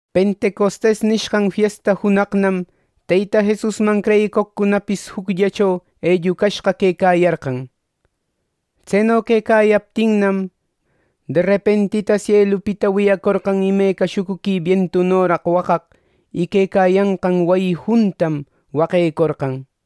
“Pentecostes” nishqan fiesta junaqnam Teyta Jesusman creyicoqcunapis jucllacho ellucashqa quecayarqan. Tseno quecayaptinnam, derepentita sielupita wiyacorqan imeca shucuqui bientunoraq waqaq; y quecayanqan wayi juntam waquecorqan.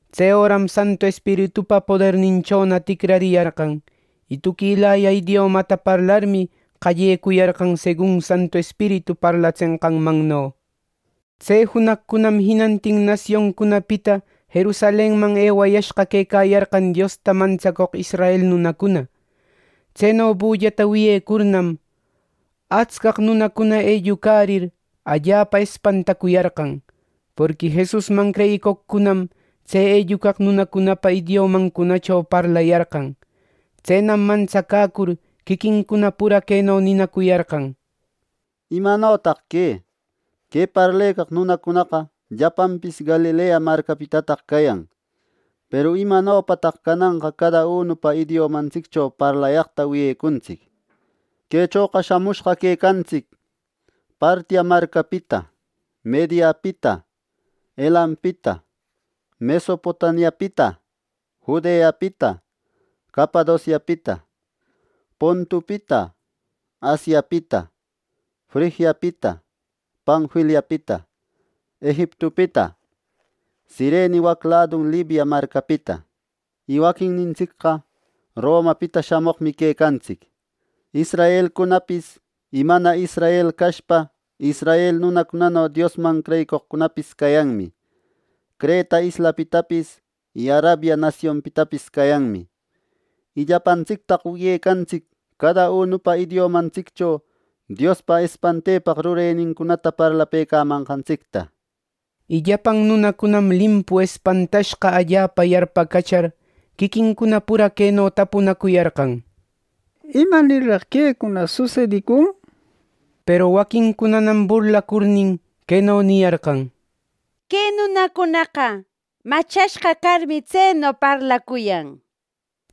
Tse öram Santu Espiritupa poderninchona ticrariyarqan, y tuquilaya idiomata parlarmi qallecuyarqan segun Santu Espiritu parlatsenqanmanno. Tse junaqcunam jinantin nasioncunapita Jerusalenman ewayashqa quecayarqan Diosta mantsacoq israel nunacuna. Tseno bullata wiyecurnam, atscaq nunacuna ellucarir, allapa espantacuyarqan, porqui Jesusman creyicoqcunam tse ellucaq nunacunapa idiomancunacho parlayarqan. Tsenam mantsacäcur, quiquincuna pura queno ninacuyarqan: —¿Imanotaq que? ¡Que parlecaq nunacunaqa llapanpis Galilea marcapitataq cayan! Peru ¿imanopataq cananqa cada unupa idiomantsiccho parlayaqta wiyecuntsic? Quechoqa shamushqa quecantsic: Partia marcapita, Mediapita, Elampita, Mesopotamiapita, Judeapita, Capadociapita, Pontupita, Asiapita, Frigiapita, Panfiliapita, Egiptupita, Cirene waq ladun Libia marcapita. Y waquinnintsicqa Romapita shamoqmi quecantsic. Israelcunapis y mana israel cashpa, israel nunacunano Diosman creyicoqcunapis cayanmi. Creta islapitapis y Arabia nasionpitapis cayanmi. ¡Y llapantsictaq wiyecantsic cada unupa idiomantsiccho Diospa espantepaq rurenincunata parlapëcamanqantsicta! Y llapan nunacunam limpu espantashqa allapa yarpacachar, quiquincuna pura queno tapunacuyarqan: —¿Imanirraq quecuna susedicun! —nishpa. Peru waquincunanam burlacurnin, queno niyarqan: —¡Que nunacunaqa machashqa carmi tseno parlacuyan! —nishpa.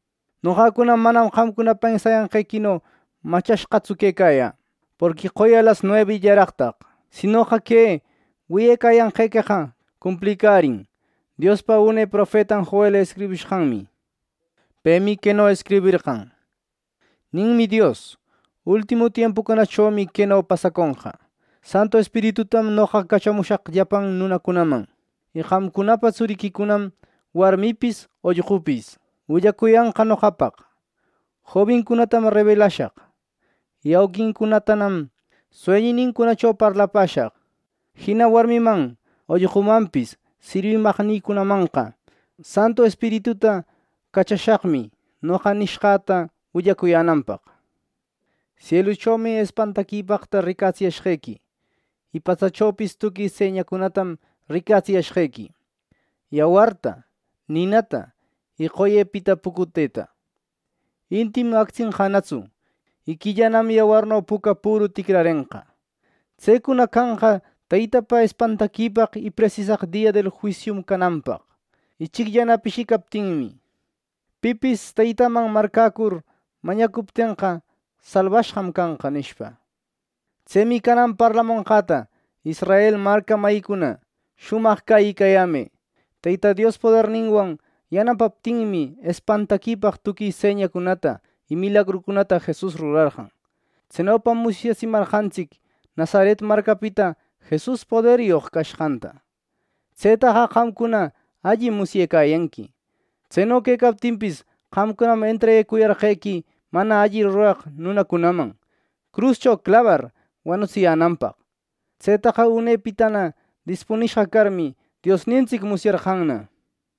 Noqacuna manam qamcuna pensayanqequino machashqatsu quecayä, porqui qoya las nuebillaraqtaq. Sinoqa que wiyecayanqequeqa cumplicärin, Diospa une profetan Joel escribishqanmi. Pemi queno escriberqan: ‘Ninmi Dios: Ultimu tiempucunachomi queno pasaconqa: Santu Espiritutam noqa cachashaq llapan nunacunaman. Y qamcunapa tsuriquicunam, warmipis ollqupis, willacuyanqa noqapaq. Jobincunatam rebelashaq, y auquincunatanam sueñïnincunacho parlapäshaq. Jina warmiman ollqumanpis sirwimaqnïcunamanqa, Santu Espirituta cachashaqmi noqa nishqäta willacuyänanpaq. Sieluchomi espantaquipaqta ricatsiyashqequi. Y patsachopis tuqui señacunatam ricatsiyashqequi: yawarta, ninata y qoyepita pucuteta. Intim actsenqanatsu, y quillanam yawarno puca püru ticrarenqa. Tsecuna canqa Teytapa espantaquipaq y presisaq dia del juisiun cananpaq, ichicllana pishicaptinmi. Pipis Teytaman marcäcur mañacuptenqa, salbashqam canqa’ nishpa. “Tsemi canan parlamonqäta, Israel marca mayicuna, shumaq cäyicayämë: Teyta Dios poderninwan yanapaptinmi, espantaquipaq tuqui señacunata y milagrucunata Jesus rurarqan. Tsenopam musyatsimarqantsic Nazaret marcapita Jesus poderyoq cashqanta. Tsetaqa qamcuna allim musyecayanqui. Tseno quecaptinpis, qamcunam entreguecuyarqequi mana alli ruraq nunacunaman, cruscho clabar wanutsiyänanpaq. Tsetaqa unepitana dispunishqa carmi, Diosnintsic musyarqanna.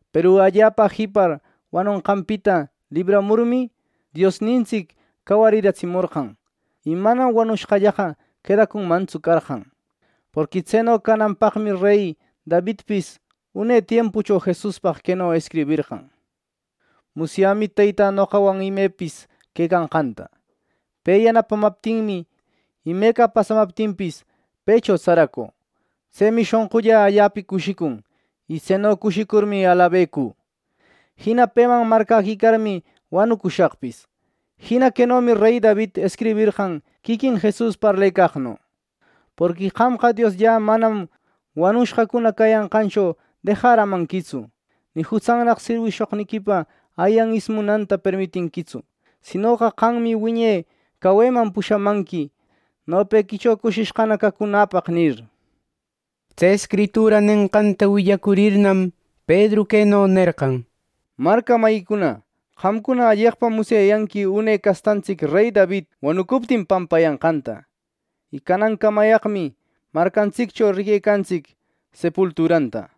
Peru allapa jipar wanonqanpita libramurmi, Diosnintsic cawariratsimorqan, y manam wanushqallaqa quedacunmantsu carqan. Porqui tseno cananpaqmi rey Davidpis une tiempucho Jesuspaq queno escriberqan: ‘Musyämi Teytä noqawan imepis quecanqanta; pe yanapamaptinmi, imeca pasamaptinpis, pëcho tsaracü. Tsemi shonqullä allapa cushicun, y tseno cushicurmi alabecü. Jina peman marcäquicarmi, wanucushaqpis.’ Jina quenomi rey David escriberqan quiquin Jesus parlecaqno: ‘Porqui qamqa Diosllä manam wanushqacuna cayanqancho dejaramanquitsu, ni jutsannaq sirwishoqniquipa ayan ismunanta permitinquitsu. Sinoqa qammi wiñe caweman pushamanqui nopequicho cushishqana cacunäpaq’ nir.” Tse escritura nenqanta willacurirnam, Pedru queno nerqan: “Marca mayicuna, qamcuna alleqpam musyayanqui une castantsic rey David wanucuptin pampayanqanta. Y canancamayaqmi marcantsiccho riquecantsic sepulturanta.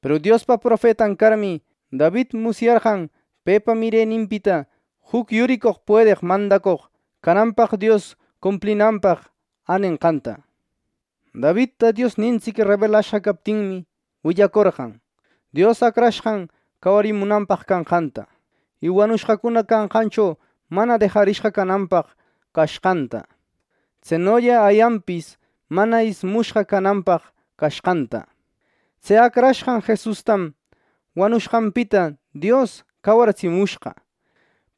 Peru Diospa profetan carmi, David musyarqan pepa mireninpita juc yuricoq puedeq mandacoq cananpaq Dios cumplinanpaq änenqanta. Davidta Diosnintsic rebelashqa captinmi, willacorqan Dios Acrashqan cawarimunanpaq canqanta, y wanushqacuna canqancho mana dejarishqa cananpaq cashqanta. Tsenolla ayanpis mana ismushqa cananpaq cashqanta. Tse acrashqan Jesustam wanushqanpita Dios cawaritsimushqa.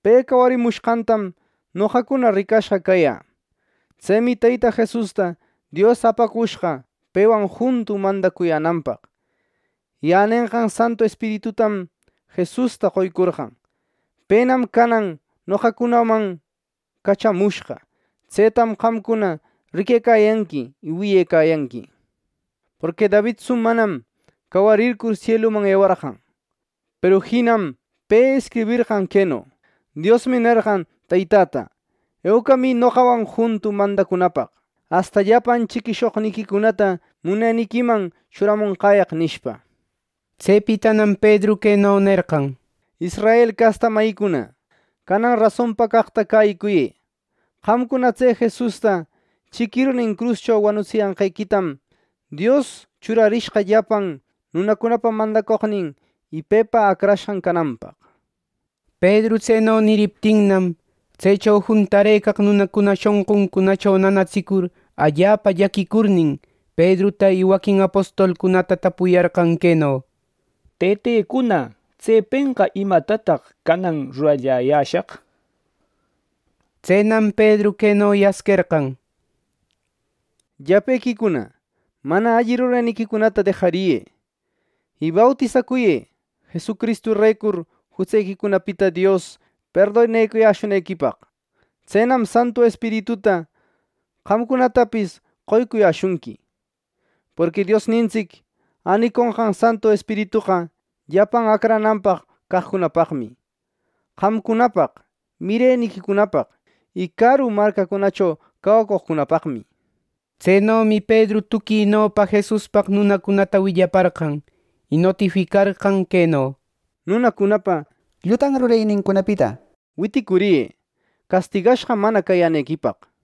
Pe cawarimushqantam noqacuna ricashqa cayä. Tsemi Teyta Jesusta Dios apacushqa pewan juntu mandacuyänanpaq. Y änenqan Santu Espiritutam Jesusta qoycorqan. Penam canan noqacunaman cachamushqa. Tsetam qamcuna riquecayanqui y wiyecayanqui. Porqui Davidtsu manam cawarircur sieluman ewarqan. Peru jinam pe escriberqan queno: ‘Diosmi nerqan Teytäta: Eucamï noqawan juntu mandacunapaq, asta llapan chiquishoqniquicunata muneniquiman churamonqäyaq’ nishpa.” Tsepitanam Pedru queno nerqan: “Israel casta mayïcuna, canan rasonpa caqta cäyicuyë: qamcuna tse Jesusta chiquirnin cruscho wanutsiyanqequitam, Dios churarishqa llapan nunacunapa mandacoqnin y Pepa Acrashqan cananpaq” nir. Pedru tseno niriptinnam, tsecho juntarëcaq nunacuna shonquncunacho nanatsicur allapa llaquicurnin, Pedruta y waquin apostolcunata tapuyarqan queno: —Tëtecuna, tsepenqa ¿imatataq canan ruralläyäshaq? —nishpa. Tsenam Pedru queno yasquerqan: —Llapequicuna, mana alli rureniquicunata dejariyë, y bautisacuyë Jesucristurecur jutsequicunapita Dios perdonecuyäshunequipaq. Tsenam Santu Espirituta qamcunatapis qoycuyäshunqui. Porqui Diosnintsic äniconqan Santu Espiritoqa llapan acrananpaq caqcunapaqmi: qamcunapaq, mireniquicunapaq y caru marcacunacho cawacoqcunapaqmi. Tsenomi Pedru tuquinopa Jesuspaq nunacunata willaparqan, y notificarqan queno: —¡Nunacuna, llutan rurenincunapita witicuriyë, castigashqa mana cayänequipaq! —nishpa.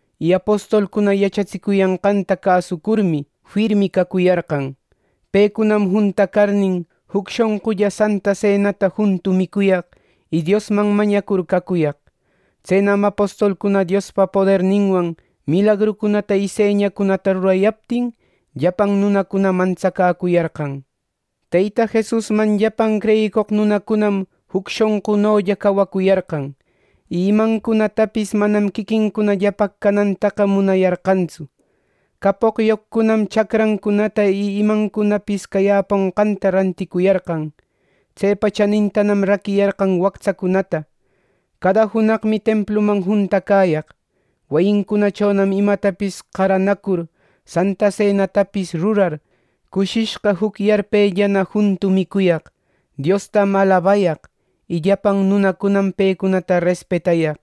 Y apostolcuna yachatsicuyanqanta cäsucurmi, firmi cacuyarqan. Pecunam juntacarnin, juc shonqulla Santa Senata juntu micuyaq, y Diosman mañacur cacuyaq. Tsenam apostolcuna Diospa poderninwan milagrucunata y señacunata rurayaptin, llapan nunacuna mantsacäcuyarqan. Teyta Jesusman llapan creyicoq nunacunam juc shonqunolla cawacuyarqan; y imancunatapis manam quiquincunallapaq canantaqa munayarqantsu. Capoqyoqcunam chacrancunata y imancunapis cayäponqanta ranticuyarqan. Tsepa chanintanam raquiyarqan wactsacunata. Cada junaqmi templuman juntacäyaq. Wayincunachonam imatapis qaranacur, Santa Senatapis rurar, cushishqa juc yarpellana juntu micuyaq, Diostam alabayaq; y llapan nunacunam pecunata respetayaq.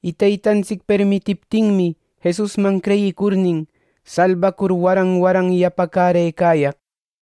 Y Teytantsic permitiptinmi, Jesusman creyicurnin, salbacur waran waran yapacärëcayaq.